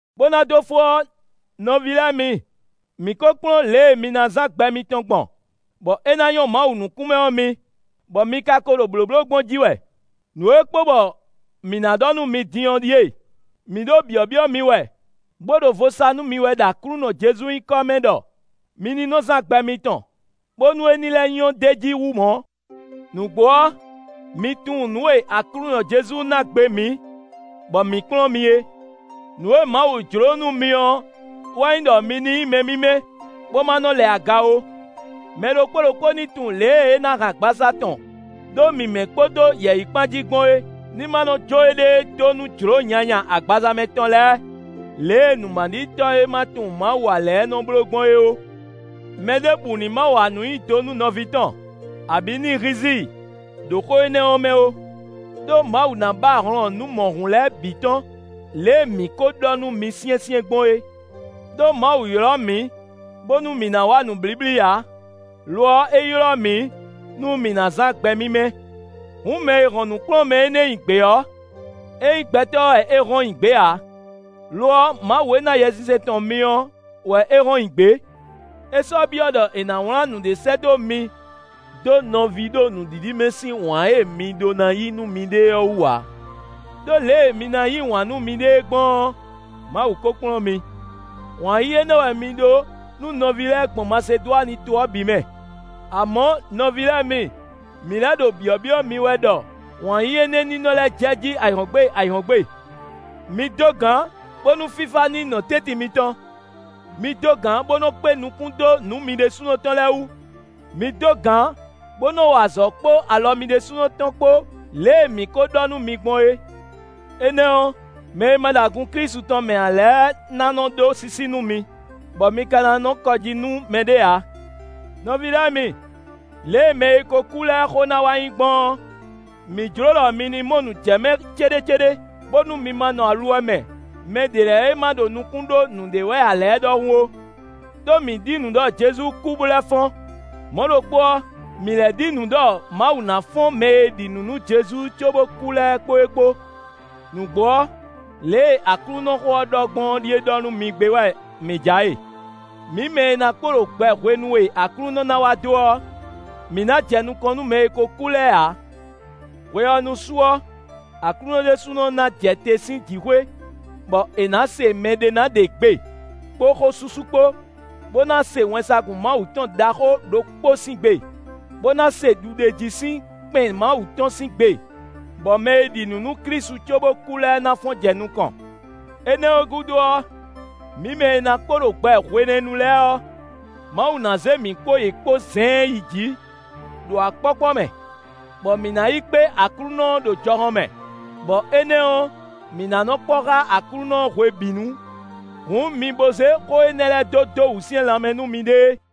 Bó ná dó fó ɔ́, nɔví lɛ́ɛ mi, mǐ kó kplɔ́n lě e mi ná zán gbɛ mitɔn gbɔn, bɔ é ná nyɔ́ Mawu nukún mɛ ɔ́ mi, bɔ mi ka ko ɖo blǒbló gbɔn jí wɛ. Nǔ e kpo bɔ mǐ ná ɖɔ nú mi din ɔ́ ɖíe: mǐ ɖo byɔ̌byɔ́ mi wɛ, bó ɖo vo sa nú mi wɛ ɖo Aklúnɔ Jezu nyǐkɔ mɛ ɖɔ mi ní nɔ zán gbɛ mitɔn, bónú é ní lɛ́ nyɔ́ d'é jí hú mɔ̌. Nǔgbó ɔ́, mi tunwun nǔ e Aklúnɔ Jezu ná gbe mǐ, bɔ mǐ kplɔ́n mi é. Nǔ e Mawu jló nú mi ɔ́ wɛ nyí ɖɔ mi ní nyí mɛ mímɛ́, bó ma nɔ lɛ aga ó. Mɛ ɖokpó ɖokpó ní tunwun lě e é ná hɛn agbaza tɔn ɖó mǐmɛ́ kpódó yɛ̌yi kpán jí gbɔn é; ní ma nɔ jó éɖée dó nú jlǒ nyanya agbaza mɛ tɔn lɛ́ɛ lě e nǔmaɖitɔ́ e ma tunwun Mawu ǎ lɛ́ɛ nɔ bló gbɔn é ó. Mɛɖěbǔ ní ma wa nǔ nyi do nú nɔví tɔn, abǐ ní hízí i ɖo xó énɛ́ ɔ́ mɛ ó; ɖó Mawu ná ba hlɔn nǔ mɔ̌hun lɛ́ɛ bǐ tɔn, lě e mǐ kó ɖɔ nú mi syɛ́nsyɛ́n gbɔn é. Đó Mawu ylɔ́ mǐ, bónú mǐ ná wa nǔ blíblí ǎ; lo ɔ́, é ylɔ́ mǐ nú mǐ ná zán gbɛ mímɛ́. Hǔn, mɛ e hɔn nǔkplɔ́nmɛ énɛ́ nyi gbě ɔ́, é nyí gbɛtɔ́ wɛ é hɔn nyi gbě ǎ; lo ɔ́, Mawu e ná Yɛsinsɛn tɔn mi ɔ́ wɛ é hɔn nyi gbě. É sɔ́ byɔ́ ɖɔ è nǎ wlán nǔɖé sɛ́ dó mi dó nɔví ɖo nǔɖiɖi mɛ sín wǎn e mi ɖó ná yí nú miɖée ɔ́ wú ǎ; ɖó lě e mi ná yí wǎn nú miɖée gbɔn ɔ́, Mawu ko kplɔ́n mi. Wǎn yíyí énɛ́ wɛ mi ɖó nú nɔví lɛ́ɛ gbɔn Masedwani to ɔ́ bǐ mɛ. Amɔ̌, nɔví lɛ́ɛ mi, mǐ lɛ́ ɖo byɔ̌byɔ́ mi wɛ ɖɔ wǎn yíyí énɛ́ ní nɔ lɛ́ jɛjí ayǐhɔ́ngbe ayǐhɔ́ngbe. Mi dó gǎn, bónú fífá ní nɔ́ nɔ tɛ́ntin mitɔn; mi dó gǎn bó nɔ́ kpé nukún dó nǔ mi ɖésúnɔ tɔn lɛ́ɛ wú; mi dó gǎn bó nɔ́ wa azɔ̌ kpó alɔ mi ɖésúnɔ tɔn kpó lě e mǐ kó ɖɔ nú mi gbɔn é. Énɛ́ ɔ́, mɛ e ma ɖo agun Klísu tɔn mɛ ǎ lɛ́ɛ ná nɔ ɖó sísí nú mi, bɔ mi ka ná nɔ kɔ jí nú mɛɖé ǎ. Nɔví lɛ́ɛ mi, lě e mɛ e ko kú lɛ́ɛ xó ná wá nyí gbɔn ɔ́, mǐ jló ɖɔ mi ní mɔ nǔ jɛ mɛ céɖécéɖé, bónú mi ma nɔ aluwɛ mɛ mɛ ɖě lɛ́ɛ e ma ɖo nukún ɖó nǔɖé wɛ ǎ lɛ́ɛ ɖɔhun ó. Đó mǐ ɖi nǔ ɖɔ Jezu kú bó lɛ́ fɔ́n; mɔ̌ ɖokpó ɔ́, mǐ lɛ́ ɖi nǔ ɖɔ Mawu ná fɔ́n mɛ e ɖi nǔ nú Jezu cóbó kú lɛ́ɛ kpó é kpó. Nǔgbó ɔ́, lě e Aklúnɔxó ɔ́ ɖɔ gbɔn ɔ́ ɖíe ɖɔ nú mi gbé wɛ mǐ ja e: mǐ mɛ e ná kpo ɖo gbɛ hwenu e Aklúnɔ ná wá dó ɔ́, mǐ ná jɛ nukɔn nú mɛ e ko kú lɛ́ɛ ǎ. Hwe ɔ́ nu su ɔ́, Aklúnɔ ɖésúnɔ ná jɛ te sín jǐxwé, bɔ è nǎ se mɛɖé ná ɖe gbe kpó xósúsú kpó, bó ná se wɛnsagun Mawu tɔn ɖaxó ɖokpó sín gbe; bó ná se ɖuɖéjí sín kpɛn Mawu tɔn sín gbe; bɔ mɛ e ɖi nǔ nú Klísu cóbó kú lɛ́ɛ ná fɔ́n jɛ nukɔn. Énɛ́ ɔ́ gúdo ɔ́, mǐ mɛ e ná kpo ɖo gbɛ hwenɛ́nu lɛ́ɛ ɔ́, Mawu ná zé mǐ kpó yě kpó zɛ̌ɛ́n yi jǐ, ɖo akpɔ́kpɔ́ mɛ, bɔ mǐ ná yi kpé Aklúnɔ ɔ́ ɖo jɔhɔn mɛ; bɔ énɛ́ ɔ́, mǐ ná nɔ kpɔ́ xá Aklúnɔ ɔ́ hwebǐnu. Hǔn mi bo zé xó énɛ́ lɛ́ɛ dó dó wǔsyɛ́n lanmɛ nú miɖée.